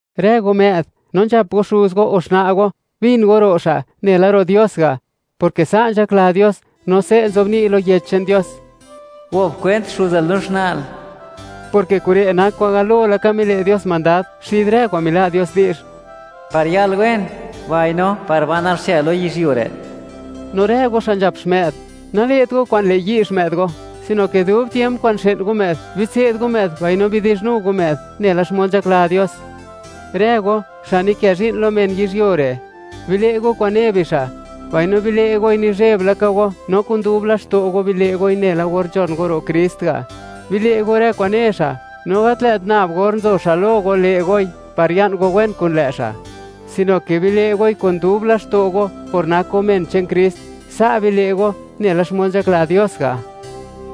Rë go më'd, no nzhap go xuz go o xna' go, bin go ro' xa', nela ro' Dios ga', porke sa' nzhakla Dios; no se' nzobni' lo Yech che'n Dios: “Gop kwent xuzal no xna'l”, porke kure' nak kwa'n galo mile' Dios mandad, xid rë kwa'n mila' Dios di'zh: “Par yal wen, mbaino par banal xche lo yizhyuo re'.” No rë go xa' nzhap xmë'd, nale't go kwa'n le' yi' xmë'd go, sino ke dub tiemp kwa'n xë'n go më'd, bitse'd go më'd mbaino bidi'zhnu go më'd nela xmod nzhakla Dios. Rë go, xa' nikë zhi'n lo men yizhyuo re', bile' go kwa'n ne bixa', mbaino bile' goi nizheb la ka go, no kun dub laxto' go bile' goi nela or nzhon go ro' Krist ga'. Bile' go rë kwa'n ne xa', no gat lë't nab or nzo xa' lo go le' goi par ya'n go wen kun lë' xa', sino ke bile' goi kun dub laxto' go, por nak go men che'n Krist. Sa' bile' go, nela xmod nzhakla Dios ga'.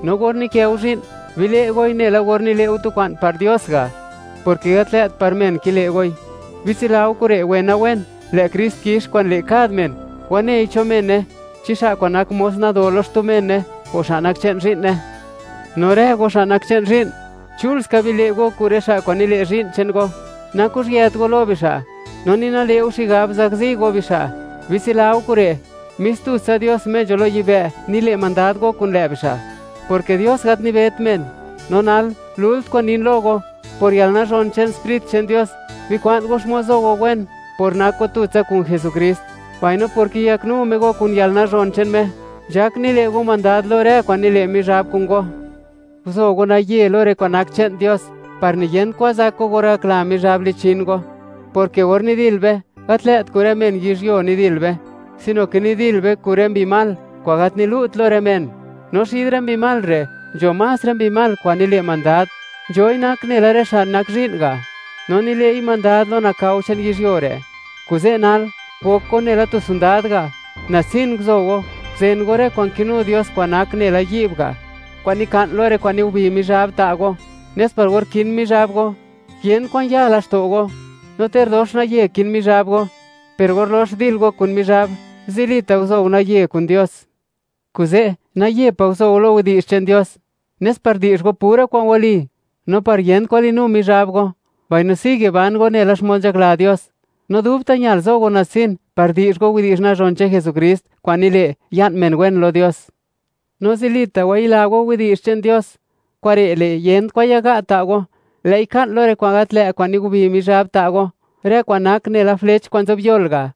No or nikë go zhi'n, bile' goi nela or nile' go tu kwa'n par Dios ga', porke gat lë't par men kile' goi. Bitsila go kure' wena-wen, lë' Krist kix kwa'n le' kad men, wanei cho mene, chi xa' kwa'n nak mos nado lo xtu mene, o xa' nak che'n zhi'ne. No rë go xa' nak che'n zhi'n; chul ska bile' go kun rë xa' kwa'n nikë zhi'n che'n go, nakuzhyët go lo bixa', no ni nale' go xigab, zakzi go bixa'. Bitsila go kure': Mis tutsa Dios, Me nzho lo yibë', nile' mandad go kun lë' bixa'; porke Dios gat nibet men. No nal, lult kwa'n nin lo go, por yalnazhon che'n Sprit che'n Dios, bikwa'n go xmod zo go wen por nak go tutsa kun Jesukrist, mbaino por kiyaknu Me go kun yalnazhon che'n Me, nzhak nile' go mandad lo rë kwa'n nile' Mizhab kun go. Guzo go naye lo rë kwa'n nak che'n Dios, par niyent kwan zak go or gakla Mizhab lichin go, porke or nidil be, gat lë't kun rë men yizhyuo nidil be, sino ke nidil be kun rë mbi mal kwa'n gat nilu't lo rë men. No xid rë mbi mal re' nzho más rë mbi mal kwa'n nile' mandad, nzhoi nak nela rë xa' nak zhi'n ga', no nile'i mandad lo nakao che'n yizhyuo re'. Kuze' nal, gok go nela tu sondad ga'. Natsin guzo go, guzen go rë kwa'n kinu Dios kwa'n nak nela yi'b ga' kwa'n nika'n lo rë kwa'n nigubi Mizhab ta' go, nes par or kin Mizhab go, yent kwan ya laxto' go, no ter dox naye kin Mizhab go. Per gor lox dil go kun Mizhab, zilita' guzo go naye kun Dios. ¡Kuze' naye pa' guzo go lo widi'zh che'n Dios!, nes par di'zh go pura kwa'n wali, no par yent kwan linu Mizhab go, mbaino sigue ban go nela xmod nzhakla Dios. No dubta' ñal zo go natsin par di'zh go widi'zh nazhon che'n Jesukrist kwa'n nile', ya'n men wen lo Dios. No zilita' wayila go widi'zh che'n Dios. Kure' le', yent kwan yaga' ta' go; lë'i ka'n lo rë kwa'n gat lë' kwa'n nigubi Mizhab ta' go, rë kwa'n nak nela flech kwa'n nzobyol ga'.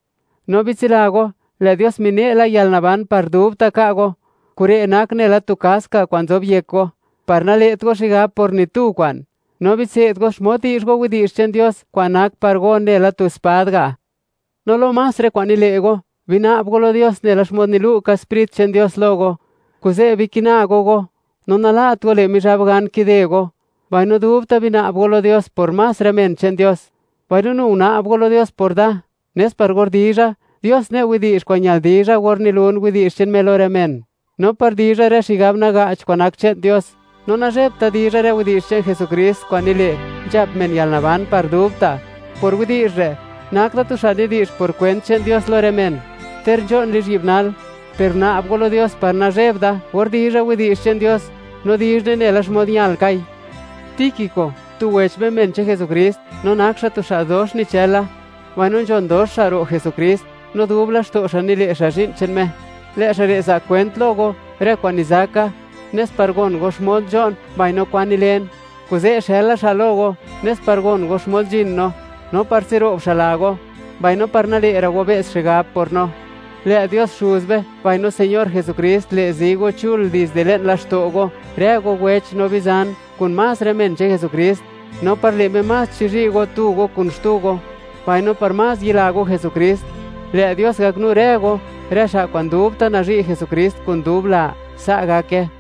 No bitsila go, lë' Dios mine' la yalnaban par dubta' ka' go, kure' nak nela tu kask ga' kwa'n nzob yek go, par nale't go xigab por ni tu kwa'n. No bitse'd go xmod di'zh go widi'zh che'n Dios, kwa'n nak par go nela tu spad ga'. No lo más rë kwa'n nile' go, bina'b go lo Dios nela xmod nilu' ka Sprit che'n Dios lo go. Kuze' bikina go go, no nala't go le' Mizhab gan kide go, mbaino dubta' bina'b go lo Dios por más rë men che'n Dios. Mbaino nu guna'b go lo Dios por da, nes par or dizha, Dios ne' widi'zh kwa'n ñal dizha or nilun widi'zh che'n Me lo rë men, no par dizha rë xigab naga'ch kwa'n nak che'n Dios, no nazhebt da dizha rë widi'zh che'n Jesukrist kwa'n nile', nzhap men yalnaban par dubta'. Por widi'zh re', nak da tu xa' nidi'zh por kwent che'n Dios lo rë men, ter nzho'n lizhyi'b nal, per guna'b go lo Dios par nazheb da, or dizha widi'zh che'n Dios, no dizhne nela xmod ñalkai. Tíquico, tu wech be men che'n Jesukrist no nak xa' tu xa' dox nichëla, mbaino nzhon dox xa' ro' Jesukrist, no dub laxto' xa' nile' xa' zhi'n che'n Me; lë' xa' re' za' kwent lo go, rë kwa'n nizaka, nes par gon go, xmod nzho'n, mbaino kwan nilen. Kuze' xëla xa' lo go, nes par gon go xmod nzhin no, no par tsiro'b xa' la go, mbaino par nale'ra' go be's xigab por no. Lë' Dios Xuz be, mbaino Señor Jesukrist, le' zi go chul dizde le'n laxto' go, rë go wech no bizan, kun más rë men che'n Jesukrist, no par le' Me, más chizhi' go tu go kun xtu go, mbaino par más yila go Jesukrist. Lë' Dios gaknu rë go, rë xa' kwa'n dubta' nazhi' Jesukrist kun dub la. Sa' gake.